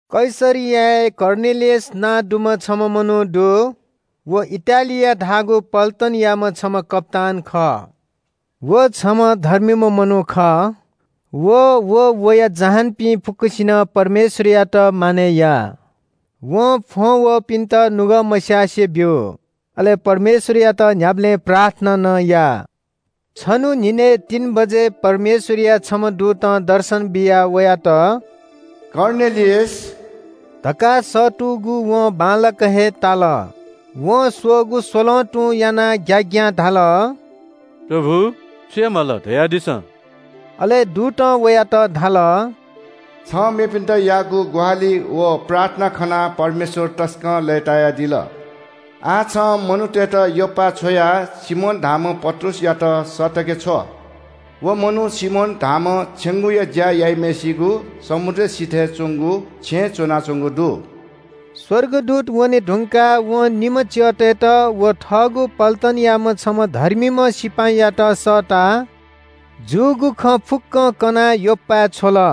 कैसरियाय् कर्नेलियस नां दुम्‍ह छम्‍ह मनू दु। व इटालिया धाःगु पल्‍टनयाम्‍ह छम्‍ह कप्‍तान खः। व छम्‍ह धर्मीम्‍ह मनू खः। व अले वया जहानपिं फुक्‍कसिनं परमेश्‍वरयात मानय् याः। वं फ्‍वं वःपिन्‍त नुगः मस्‍यासे ब्‍यू। अले परमेश्‍वरयात न्‍ह्याबलें प्रार्थना नं याः। छन्‍हु न्‍हिनय् तीन बजे परमेश्‍वरया छम्‍ह दूतं दर्शन बियाः वयात – “कर्नेलियस” धकाः सःतूगु वं बांलाक हे ताल। वं स्‍वःगु स्‍वलं तुं यानाः ग्‍याग्‍यां धाल – “प्रभु, छु याये माल, धयादिसँ?” अले दूतं वयात धाल – “छं मेपिन्‍त याःगु ग्‍वाहालि व प्रार्थना खनाः परमेश्‍वर तसकं लय्‌तायादिल। आः छं मनूतय्‌त योप्‍पाय् छ्वयाः सिमोन धाःम्‍ह पत्रुसयात सःतके छ्व। व मनू सिमोन धाःम्‍ह छेंगूया ज्‍या याइम्‍हय्‌सिगु समुद्र सिथय् च्‍वंगु छेँय् च्‍वनाच्‍वंगु दु।” स्‍वर्गदूत वने धुंकाः वं निम्‍ह च्‍यःतय्‌त व थःगु पल्‍टनयाम्‍ह छम्‍ह धर्मीम्‍ह सिपाइँयात सःताः जूगु खँ फुक्‍कं कनाः योप्‍पाय् छ्वल।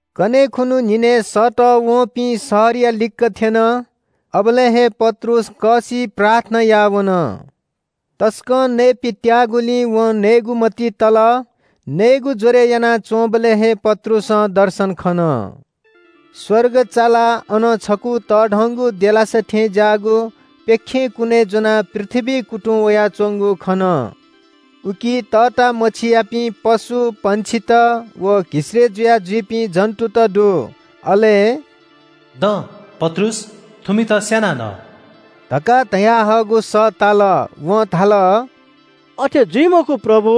कन्‍हय् खुन्‍हु न्‍हिनय् सःतःवंपिं शहरया लिक्‍क थ्‍यन। अबलय् हे पत्रुस कःसिइ प्रार्थना याः वन। तसकं नये पित्‍याःगुलिं वं नयेगु मतिइ तल। नयेगु ज्‍वरय् यानाच्‍वंबलय् हे पत्रुसं दर्शन खन। स्‍वर्ग चालाः अनं छकू तःधंगु देलासा थें ज्‍याःगु प्‍यखें कुन्‍चाय् ज्‍वनाः पृथ्‍वीइ कुतुं वयाच्‍वंगु खन। उकी तःता मछियापिं पशु, पंक्षित व घिसय्‌ जुया जुइपिं जन्‍तुत दु। अले “दँ पत्रुस, थुमित स्‍यानाः न” धकाः धयाहःगु सः ताल। वं धाल – “अथे जुइ मखु, प्रभु।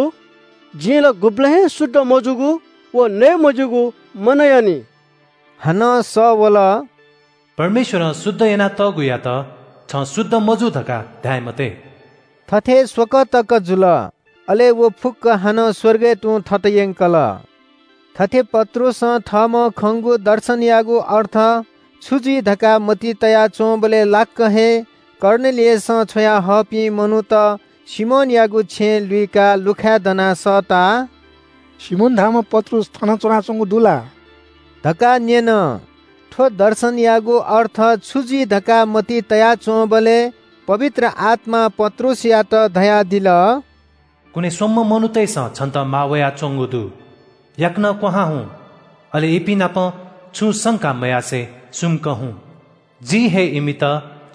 जिं ला गुबलें हे शुद्ध मजूगु व नये मज्‍यूगु मनयानि।” हानं सः वल – “परमेश्‍वरं शुद्ध याना तःगुयात छं शुद्ध मजू धकाः धाये मते।” थथे स्‍वकः तक जुल। अले व फुक्‍क हानं स्‍वर्गय् तुं थत यंकल। थथे पत्रुसं थःम्‍हं खंगु दर्शनयागु अर्थ छु जुइ धकाः मतिइ तया च्‍वंबलय् लाक्‍क हे कर्नेलियसं छ्वयाहःपिं मनूत सिमोनयागु छेँ लुइकाः लुखाय् दनाः सःताः “सिमोन धाःम्‍ह पत्रुस थन च्‍वनाच्‍वंगु दु ला” धकाः न्‍यन। थ्‍व दर्शनयागु अर्थ छु जुइ धकाः मतिइ तया च्‍वंबलय् पवित्र आत्‍मां पत्रुसयात धयादिल – “कुने स्‍वम्‍ह मनूतय्‌सं छन्‍त माः वयाच्‍वंगु दु। याकनं क्‍वहां हुँ, अले इपिं नाप छुं संका मयासें सुमुक हुँ। जिं हे इमित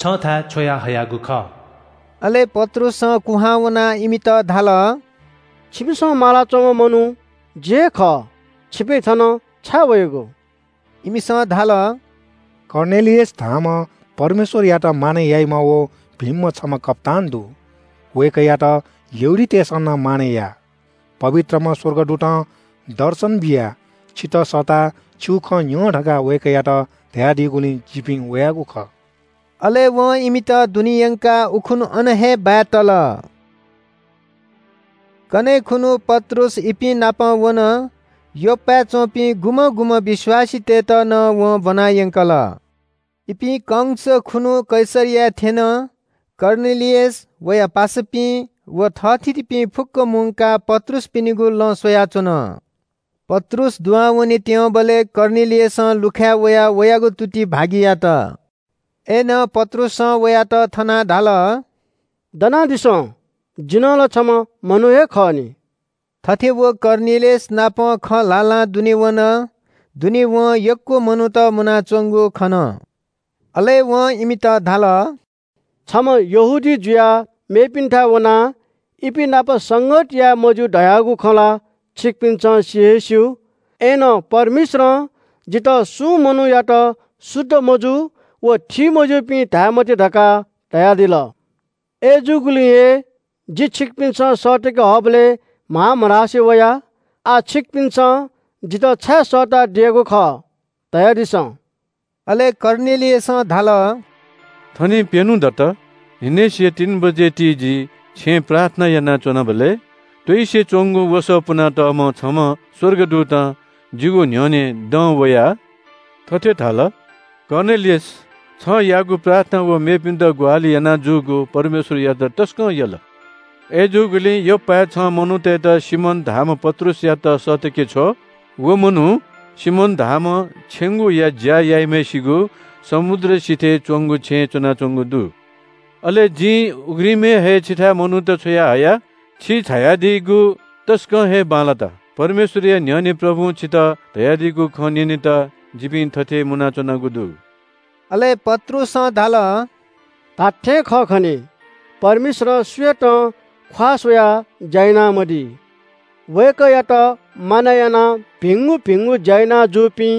छन्‍थाय् छ्वयाहयागु खः।” अले पत्रुसं कुहां वनाः इमित धाल – “छिमिसं मालाच्‍वंम्‍ह मनू जि हे खः। छिपिं थन छाय् वयागु?” इमिसं धाल – “कर्नेलियस धाःम्‍ह परमेश्‍वरयात मानय् याइम्‍ह व भिंम्‍ह छम्‍ह कप्‍तान दु। वय्‌कःयात यहूदीतय्‌सं नं मानय् याः। पवित्रम्‍ह स्‍वर्गदूतं दर्शन बियाः छितः सःताः छिगु खँ न्‍यँ धकाः वय्‌कःयात धयादीगुलिं जिपिं वयागु खः।” अले वं इमित दुने यंकाः उखुन्‍हु अन हे बाय् तल। कन्‍हय् खुन्‍हु पत्रुस इपिं नाप वन। योप्‍पाय् च्‍वंपिं गुम्‍हं गुम्‍हं विश्‍वासीतय्‌त नं वं ब्‍वनायंकल। इपिं कंस खुन्‍हु कैसरियाय् थ्‍यन। कर्नेलियस, वया पासापिं व थःथितिपिं फुक्‍क मुंकाः पत्रुसपिनिगु लँ स्‍वयाच्‍वन। पत्रुस दुहां वनेत्‍यंबलय् कर्नेलियसं लुखाय् वयाः वयागु तुति भागि यात। अय्‌नं पत्रुसं वयात थनाः धाल – “दनादिसँ, जि नं ला छम्‍ह मनू हे खः नि।” थथे व कर्नेलियस नाप खँ ल्‍हाल्‍हां दुने वन। दुने वं यक्‍व मनूत मुनाच्‍वंगु खन। अले वं इमित धाल – “छम्‍ह यहूदी जुयाः मेगु जातियापिन्‍थाय् वनाः इपिंनापं संगत याये मज्‍यू धयागु खँ ला छिकपिन्‍सं सि हे स्‍यू। अय्‌नं परमेश्‍वरं जितः सुं मनूयात शुद्ध मजू व थीमज्‍यूपिं धाये मते धकाः धयादिल। अय्‌जूगुलिं हे जि छिकपिन्‍सं सःतके हःबलय् म्‍हां मधासे वया। आः छिकपिन्‍सं जितः छाय् सःतादियागु खः, धयादिसँ।” अले कर्नेलियसं धाल – “थनिं प्‍यन्‍हु दत, न्‍हिनेसिया तीन बजे ति जि छेँय् प्रार्थना यानाच्‍वनाबलय् त्‍वइसे च्‍वंगु वसः पुनातःम्‍ह छम्‍ह स्‍वर्गदूतं जिगु न्‍ह्यःने दं वयाः थथे धाल – ‘कर्नेलियस, छं याःगु प्रार्थना व मेपिन्‍त ग्‍वाहालि याना जूगु परमेश्‍वरयात तसकं यल। अय्‌जूगुलिं योप्‍पाय् छं मनूतय्‌त सिमोन धाःम्‍ह पत्रुसयात सःतके छ्व। व मनू सिमोन धाःम्‍ह छेंगूया ज्‍या याइम्‍हय्‌सिगु समुद्र सिथय् च्‍वंगु छेँय् च्‍वनाच्‍वंगु दु।’ अले जिं उघ्रिमय् हे छिथाय् मनूत छ्वयाहया। छि झायादीगु तसकं हे बांलात। परमेश्‍वरया न्‍ह्यःने प्रभुं छितः धयादीगु खँ न्‍यनेत जिपिं थथे मुनाच्‍वनागु दु।” अले पत्रुसं धाल – “धात्‍थें खः खनी, परमेश्‍वरं सुयातं ख्‍वाः स्‍वयाः ज्‍या यानामदी। वय्‌कःयात मानय् यानाः भिंगु भिंगु ज्‍या याना जूपिं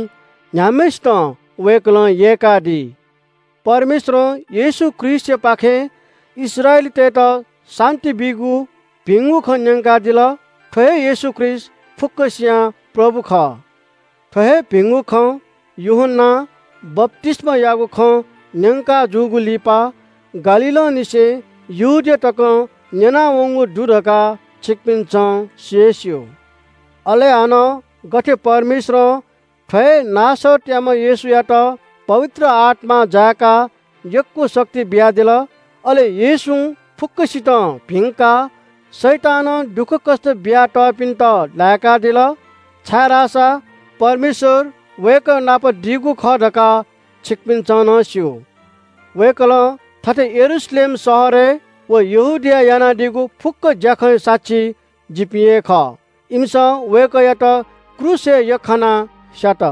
न्‍ह्याम्‍हय्‌सितं वय्‌कलं यय्‌कादी। परमेश्‍वरं येशू ख्रीष्‍टयापाखें इस्राएलीतय्‌त शान्‍ति बीगु भिंगु खँ न्‍यंकादिल। थ्‍व हे येशू ख्रीष्‍ट फुक्‍कसियां प्रभु खः। थ्‍व हे भिंगु खँ यूहन्‍नां बप्‍तिस्‍मायागु खँ न्‍यंकाजूगु लिपा गालीलंनिसें यहूदिया तकं न्‍यनावंगु दु धकाः छिकपिन्‍सं सि हे स्‍यू। अले हानं गथे परमेश्‍वरं थ्‍व हे नासरतयाम्‍ह येशूयात पवित्र आत्‍मां जाय्‌काः यक्‍व शक्ति बियादिल। अले येशूं फुक्‍कसितं भिंकाः शैतानं दुःखकष्‍ट बियातःपिन्‍त लाय्‌कादिल। छाय्‌धाःसा परमेश्‍वर वय्‌कः नाप दीगु खः धकाः छिकपिन्‍सं नं स्‍यू। “वय्‌कलं थथे यरूशलेम शहरय् व यहूदियाय् यानादीगु फुक्‍क ज्‍याखँया साक्षी जिपिं हे खः। इमिसं वय्‌कःयात क्रूसय् यख्‍खानाः स्‍यात।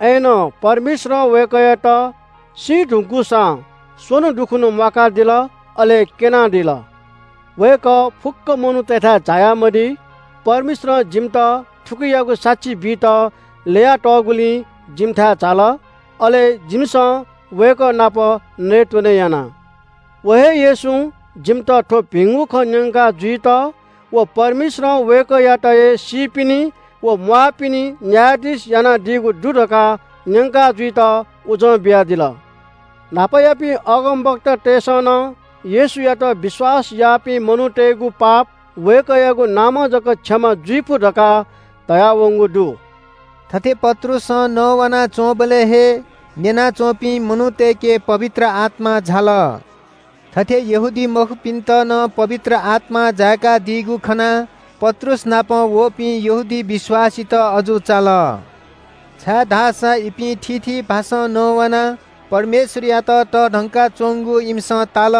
अय्‌नं परमेश्‍वरं वय्‌कःयात सी धुंकूसां स्‍वन्‍हु दुखुन्‍हु म्‍वाकादिल अले क्‍यनादिल। वय्‌कः फुक्‍क मनूतय्‌थाय् झाया मदी। परमेश्‍वरं जिमित थुकियागु साक्षी बीत ल्‍यया तःगुलिं जिमिथाय् झाल। अले जिमिसं वय्‌कः नाप नयेत्‍वने याना। व हे येशूं जिमित थ्‍व भिंगु खँ न्‍यंका जुइत व परमेश्‍वरं वय्‌कःयात हे सीपिनि व म्‍वाःपिनि न्‍यायाधीश यानादीगु दु धकाः न्‍यंका जुइत उजं बियादिल। न्‍हापायापिं अगमवक्तातय्‌सं नं येशूयात विश्‍वास याःपिं मनूतय्‌गु पाप वय्‌कःयागु नामं जक क्षमा जुइफु धकाः धयावंगु दु।” थथे पत्रुसं नवानाच्‍वंबलय् हे न्‍यना च्‍वंपिं मनूतय्‌के पवित्र आत्‍मा झाल। थथे यहूदीमखुपिन्‍त नं पवित्र आत्‍मां जाय्‌कादीगु खनाः पत्रुस नाप वःपिं यहूदी विश्‍वासीत अजू चाल, छाय्‌धाःसा इपिं थीथी भाषां नवानाः परमेश्‍वरयात तःधंका च्‍वंगु इमिसं ताल।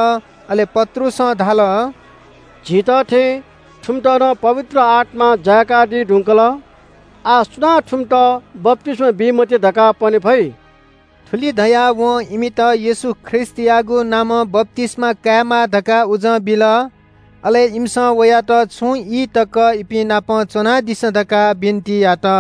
अले पत्रुसं धाल – “झीत थें थुमित नं पवित्र आत्‍मां जाय्‌कादी धुंकल। आः सुनां थुमित बप्‍तिस्‍मा बी मते धकाः पने फइ?” थुलि धयाः वं इमित येशू ख्रीष्‍टयागु नामं बप्‍तिस्‍मा कायेमाः धकाः उजं बिल। अले इमिसं वयात छुं ई तक इपिंनापं च्‍वनादिसँ धकाः बिन्‍ति यात।